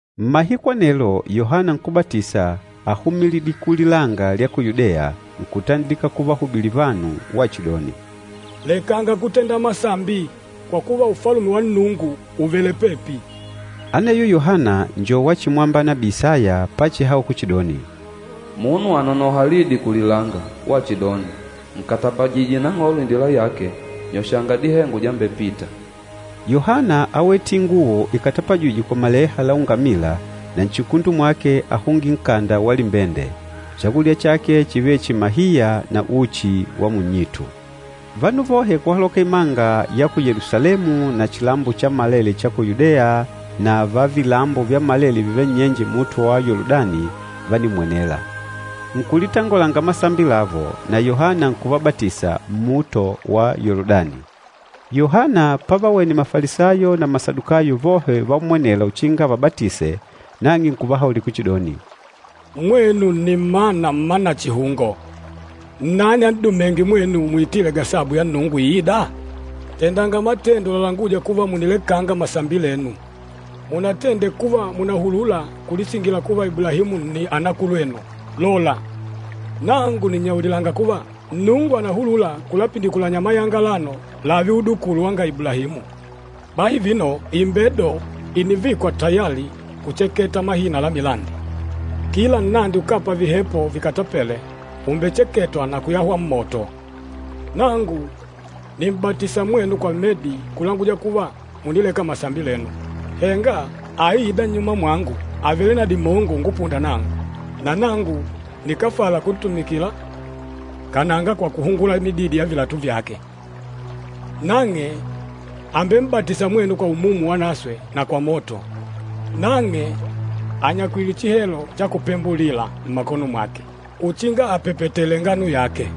Mmahiku anelo, Yohana Nkúbatisa áhumilidile kulilanga lya ku Yudeya, nkutandilika kuvahubilila vanu, wachidoni, “Lekanga kutenda masambi, kwa kuva, Ufalume wa Nnungu ùvele pepi.” Aneyo Yohana njo wachimwamba nabii Isaya pachihaula kuchidoni, “Munu ànonoha lidi kulilanga, wachidoni, ‘Nkatapajije Nang'olo indila yake, nyoshanga dihengo dyambepita.’” Yohana áwete inguwo ikatapajîjwe kwa maleha la ungamila na nchikundu mwake áhungile nkanda wa limbende. Chakulya chake chívele chihi mahiya na uchi wa munnyitu. Vanu vohe kuhaloka imanga ya ku Yelusalemu na chilambo chammalele cha ku Yudeya na va vilambo vyammalele vivêle nnyenje luhunde lwa Yoludani, vánimmwenela. Nkulitangolanga masambi lavo, na Yohana nkuvabatisa nnuhunde lwa Yoludani. Yohana pavawene Mafalisayo na Masadukayo vohe uvammwenela uchinga avabatise, nang'e nkuvahaulila kuchidoni, “Mwenu nni mmana mma nachihungo! Nnani an'dumênge mwenu muitile gasabu ya Nnungu iîda? Tendanga matendo lalanguja kuva munilekanga masambi lenu. Munatende kuva mùnahulula kulisingila kuva Iblahimu nni anakulwenu! Lola, nangu nìnnyaulilanga kuva, Nnungu ànahulula kulapindikulanya mayanga alano lààve udukulu wanga Iblahimu. Bahi vino imbedo ìnivikwa tayali kucheketa mahina la milandi. Kila nnandi ukápa vihepo vikatapêle umbecheketwa na kuyahwa mmoto. Nangu nìm'batisa mwenu kwa medi kulanguja kuva mùnileka masambi lenu. Henga aîda nnyuma mwangu àvele na dimongo ungupunda nangu, na nangu nikáfala kuntumikila kananga kwa kuhungula mididi ya vilatu vyake. Nang'e àmbem'batisa mwenu kwa Umumu Wanaswe na kwa moto. Nang'e ànyakwile chihelo cha kupembulila mmakono mwake uchinga apepetele ngano yake.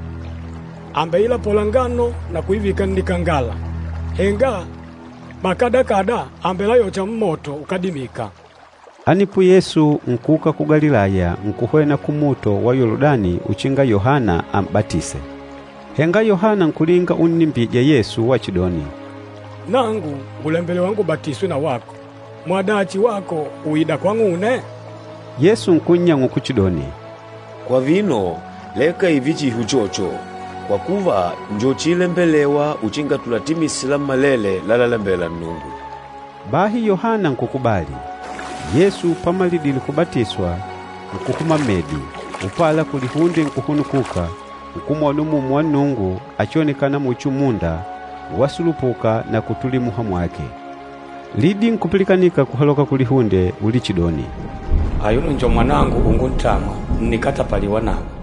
Àmbeilapola ngano na kuivika nnikangala, henga mahahi àmbelayocha mmoto ukádimika.” Anepo Yesu nkuuka ku Galilaya, nkuhwena kuluhunde lwa Yoludani, uchinga Yohana am'batise. Henga Yohana nkulinga unnimbija Yesu wachidoni, “Nangu ngùlembelewa ngubatiswe na wako, mwadachi wako ùida kwang'une?” Yesu nkunnyang'ula kuchidoni, “Kwa vino, leka ììve chihi uchocho, kwa kuva njo chiilembelewa tulatende lammalele lalalembela Nnungu.” Bahi Yohana nkukubali. Yesu pamalidile kubatiswa, nkuhuma mmedi, upala kulihunde nkuhunukuka, nkumwona Umumu wa Nnungu achionekâna muchi umunda, wasulupuka na kutulila muha mwake. Lidi nkupilikanika kuhaloka kulihunde ulichidoni, “Ayuno njo Mwanangu unguntamwa, ǹnikatapaliwa nawe.”